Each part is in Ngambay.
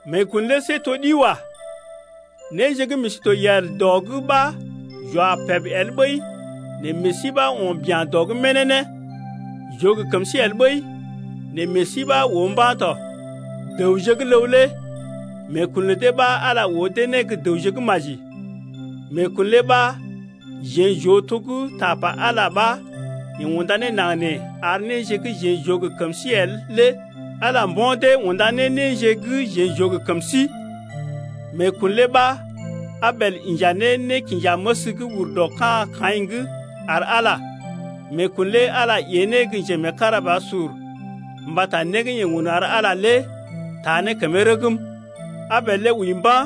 Meekun lé see to ɗi wa. Néje gə́ meḛ sí to yel dɔ’g ɓa j’wa peb el ɓəi nɛ meḛ sí ɓa to dɔ’g bururu ya. J’oo gə kəm sí el ɓəi nɛ meḛ sí ɓa oo mba̰ tɔ. Dəwje gə́ ləw lé meekun lə dee ɓa Ala oo dee ne gə́ dəwje gə́ maji. Meekun lé ɓa jeḛ j’oo to gə́ tapa Ala ɓa yeḛ unda ne naŋg nee ar néje gə́ jeḛ j’oo gə kəm sí el lé Ala mbo̰ dee unda ne néje gə́ jeḛ j’oo gə kəm sí. Meekun lé ɓa Abel inja nékinjaməs gə́ ur dɔ ka̰ Kaḭ’g ar Ala. Meekun lé Ala ée ne gə́ njemeekarabasur mbata né gə́ yeḛ un ar Ala lé taa ne kəmee rəgm. Abel lé wəi mba̰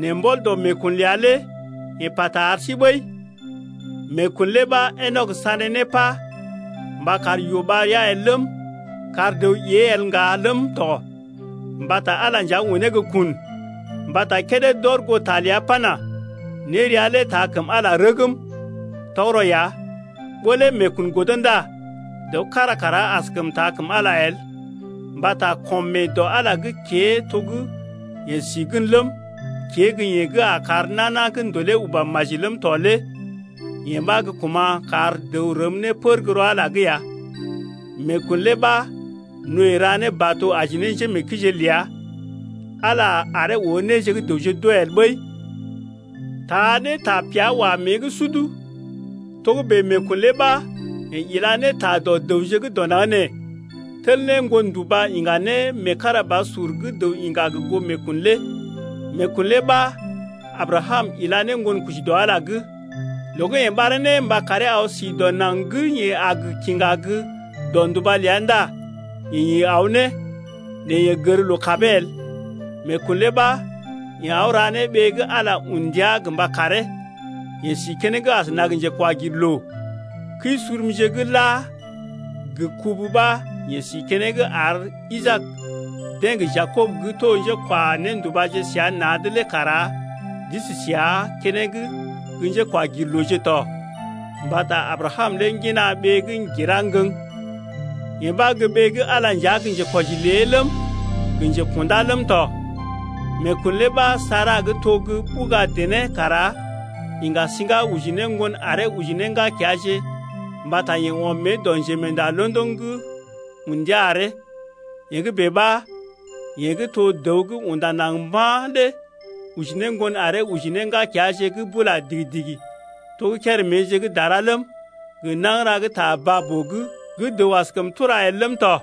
nɛ mbɔl dɔ meekun ləa lé yeḛ pata ar sí ɓəi. Meekun lé ɓa Enɔk sané ne pá mba kar yoo ɓar ria el ləm, kar dəw ée el ŋga ləm tɔ mbata Ala nja unee gə́ kun, mbata kédé d’ɔr goo ta ləa pana: Nérea lé taa kəm Ala rəgm. Tɔgərɔ ya, ɓó lé meekun godo ndá dəw kára kara askəm taa kəm Ala el. Mbata kɔm mee dɔ Ala’g kée to gə́ yeḛ si gən ləm, kée gə́ yeḛ gə́ a kar nana gə́ ndolè uba maji ləm tɔ lé yee ɓa gə́ kuma̰ kar dəw rəm ne pər gə́ rɔ Ala’g ya. Meekun lé ɓa Noe ra ne bato aji ne njémeekəije ləa. Ala aree oo néje gə́ dəwje d’oo el ɓəi, taa ne tapea wá mée’g sud. Togə́bè meekun lé ɓa yeḛ ila ne ta dɔ dəwje gə́ dɔ naŋg nee, tel ne ŋgon nduba iŋga ne meekarabasur gə́ dəw iŋga gə goo meekun lé. Meekun lé ɓa Abrakam ila ne ŋgonkoji dɔ Ala’g. Loo gə́ yeḛ ɓaree ne mba karee aw si dɔ naŋg gə́ yeḛ a gə kiŋga gə́ dɔ nduba ləa ndá yeḛ ḭ aw ne, nɛ yeḛ gər loo kabee el. Meekun lé ɓa yeḛ aw ra ne ɓee gə́ Ala un ndia gə mba karee. Yeḛ si keneŋ asəna gə njekwagirloo. Kəi-surumje gə́ la gə kubu ɓa yeḛ si keneŋ ar Isaak, deḛ gə Jakob gə́ to njékwa-néndubaje səa na̰’d lé kara d’isi səa keneŋ gə́ njékwagirlooje tɔ. Mbata Abrakam lé ŋgina ɓee gə́ ŋgira ŋgəŋ, yee ɓa gə́ ɓee gə́ Ala nja gə́ njekwɔji lé ləm, gə njekṵdá ləm tɔ. Meekun lé ɓa Sara gə́ to gə́ ɓuga dené kara iŋga siŋga oji ne ŋgon aree oji ne ŋgakeaje mbata yeḛ ɔm mée dɔ njemeenda londoŋ gə́ un ndia aree. Yee gə́ bèe ɓa yeḛ gə́ to dəw gə́ unda naŋg mba̰ lé oji ne ŋgon aree oji ne ŋgakeaje gə́ bula digi-digi to gə́ kéréméje gə́ dara ləm, gə nagəra gə́ ta baa-boo’g gə́ dəw askəm tura el ləm tɔ.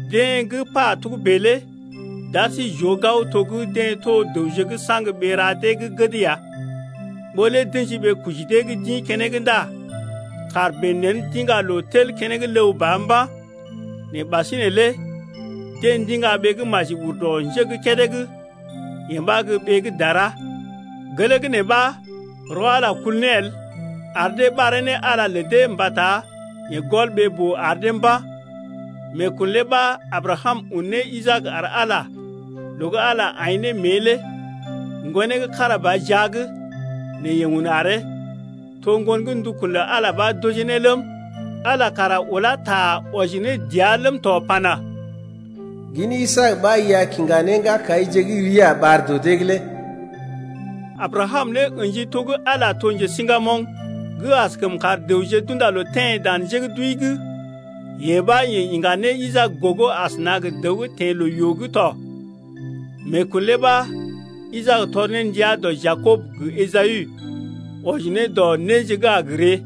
Deḛ gə́ pa togə́bè lé d’ar sí j’oo gao to gə́ deḛ to dəwje gə́ saŋg ɓee-ra dee gə́ gəd ya. Ɓó lé d’ə̰ji ɓee-koji dee gə́ d’ḭ keneŋ ndá kàr bèe nḛ d’iŋga loo tel keneŋ ləw ba mba̰. Nɛ ɓasinè lé deḛ ndiŋga ɓee gə́ maji ur dɔ nje gə́ kédé’g, yee ɓa gə́ ɓee gə́ dara. Gelee gə́ nee ɓa rɔ Ala kul ne el, ar dee ɓaree ne Ala lə dee mbata yeḛ gɔl ɓee-boo ar dee mba̰. Meekun lé ɓa Abrakam un ne Isaak ar Ala loo gə́ Ala aḭ ne mée lé. Ŋgonee gə́ kára ba jia’g, nɛ yeḛ un aree. To ŋgon gə́ ndukun lə Ala ɓa d’ojee ne ləm 8Ala kara ulá ta wɔji ne dəa ləm tɔ pana: Gin Isaak ɓa i a kiŋga ne ŋgakaije gə́ rii a ɓar dɔ dee’g lé. Abrakam lé ə̰ji to gə́ Ala to njesiŋgamoŋ gə́ askəm kar dəwje d’unda loo teḛ dan njé gə́ d’wəi’g. Yee ɓa yeḛ iŋga ne Isaak gogo asəna gə dəw gə́ teḛ loo-yoo’g tɔ. Meekun lé ɓa Isaak tɔr ne ndia dɔ Jakob gə Esawu’g, wɔji ne dɔ néje gə́ a gə ree.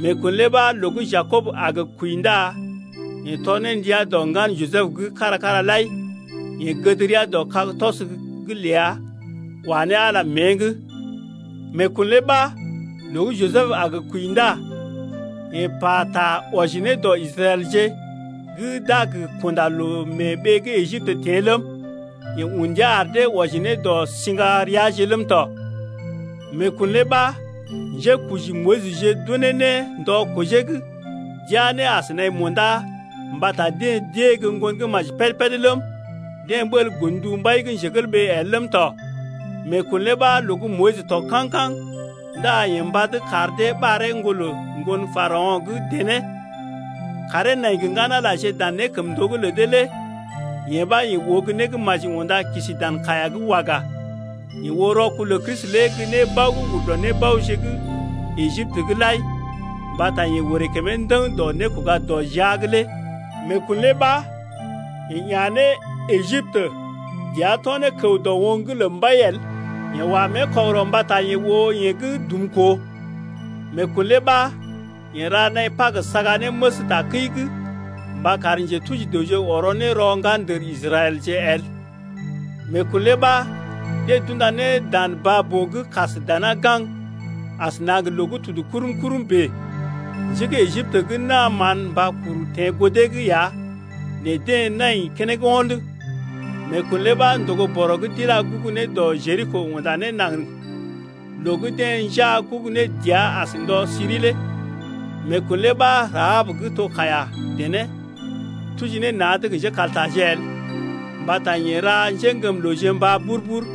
Meekun lé ɓa loo gə́ Jakob a gə kwəi ndá yeḛ tɔr ne ndia dɔ ŋgan Jisəb’g kára-kára lai. Yeḛ gəd rəa dɔ kag-tɔs’g ləa wa ne Ala mée’g. Meekun lé ɓa loo gə́ Jisəb gə́ a gə kwəi ndá yeḛ pata gə́ wɔji ne dɔ Israɛlje gə́ d’a gə kunda loo mee ɓee gə́ Ejiptə teḛ ləm, yeḛ un ndia ar dee wɔji ne dɔ sḭgareaje ləm tɔ. Meekun lé ɓa njékoji Moyisje d’unee ne ndɔ kojee’g d’iya ne as naḭ munda mbata deḛ d’ée gə́ ŋgon gə́ maji péd-péd ləm, deḛ ɓəl godndu mbai el ləm tɔ. Meekun lé ɓa loo gə́ Moyis tɔg kaŋ-kaŋ ndá yeḛ mbad kar dee ɓaree ŋgolə ŋgon Parao̰ gə́ dené. Karee nai gə ŋgan-Alaje dan nékəmndoo’g lə dee lé yee ɓa yeḛ oo gə́ né gə́ maji unda kisi dan kaiya’g waga. Yeḛ oo rɔkul lə Kristi lé gə́ nébao gə́ ur dɔ nébaoje gə́ Ejiptə’g lai mbata yeḛ orè kəmee ndəŋ dɔ nékoga-dɔ-jia’g lé. Meekun lé ɓa yeḛ ya̰ ne Ejiptə, dəa to̰ ne kəw dɔ oŋg’g lə mbai el, yeḛ wa mée kɔgərɔ mbata yeḛ oo yeḛ gə́ dumkoo. Meekun lé ɓa yeḛ ra naḭ Pag saga ne məs takəi’g, mba kar njetuji dəwje ɔrɔ ne rɔ ŋgandər Israɛlje el. Meekun lé ɓa deḛ d’unda ne dan baa-boo gə́ kas dana gaŋg asəna gə loo gə́ tudu kurum-kurum bèe. Njé gə́ Ejiptə gə́ naa mán mba kuru teḛ goo dee’g ya nɛ deḛ nai keneŋ wo̰d. Meekun lé ɓa ndògo-bɔrɔ gə́ d’ilá gugu ne dɔ Jeriko unda ne naŋg loo gə́ deḛ njaa gugu ne dəa as ndɔ siri lé. Meekun lé ɓa Rahab gə́ to kaiya-dené tuji ne na̰’d gə njékaltaje el, mbata yeḛ ra njéŋgəmlooje mbá bur-bur.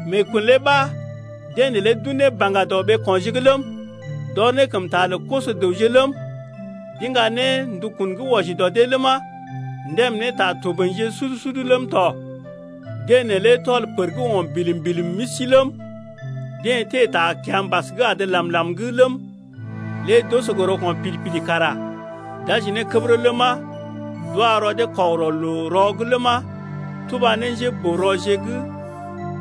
Meekun lé ɓa deḛ neelé d’un ne baŋga dɔ ɓeeko̰je’g ləm, d’ɔr ne kəmta lə koso-dəwje ləm, d’iŋga ne ndukun gə́ wɔji dɔ dee ləma, ndèm ne ta toboḭje sud-sud ləm tɔ. Deḛ neelé tɔl pər gə́ o̰ bilim-bilim misi ləm, deḛ teḛ ta kiambas gə́ adə làm-làm’g ləm, lé d’oso gə rɔko̰ pid-pid kara d’aji ne kədərə ləma, d’wa rɔ dee kɔgərɔ loo-rɔ’g ləma, tuba ne njéboo-rɔje gə́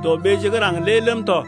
dɔ ɓeeje gə́ raŋg lé ləm tɔ.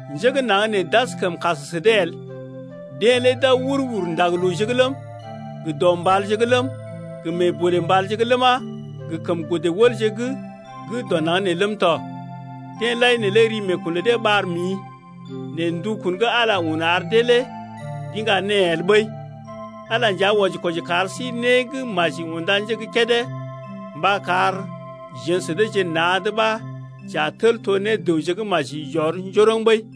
Njé gə́ naŋg nee d’askəm kas sə dee el, deḛ lé d’aw wur-wur ndag-looje’g ləm, gə dɔ mbalje’g ləm, gə mee bolè mbalje’g ləma, gə kəm godə wəlje’g gə́ dɔ naŋg nee ləm tɔ. Deḛ lai neelé ri meekun lə dee ɓar mḭ, nɛ ndukun gə́ Ala un ar dee lé d’iŋga née el ɓəi. Ala nja wɔji-kwɔji kar sí né gə́ maji unda nje gə́ kédé mba kar jeḛ sə deeje na̰’d ɓa j’a tel to ne dəwje gə́ maji j’ɔr njoroŋ ɓəi.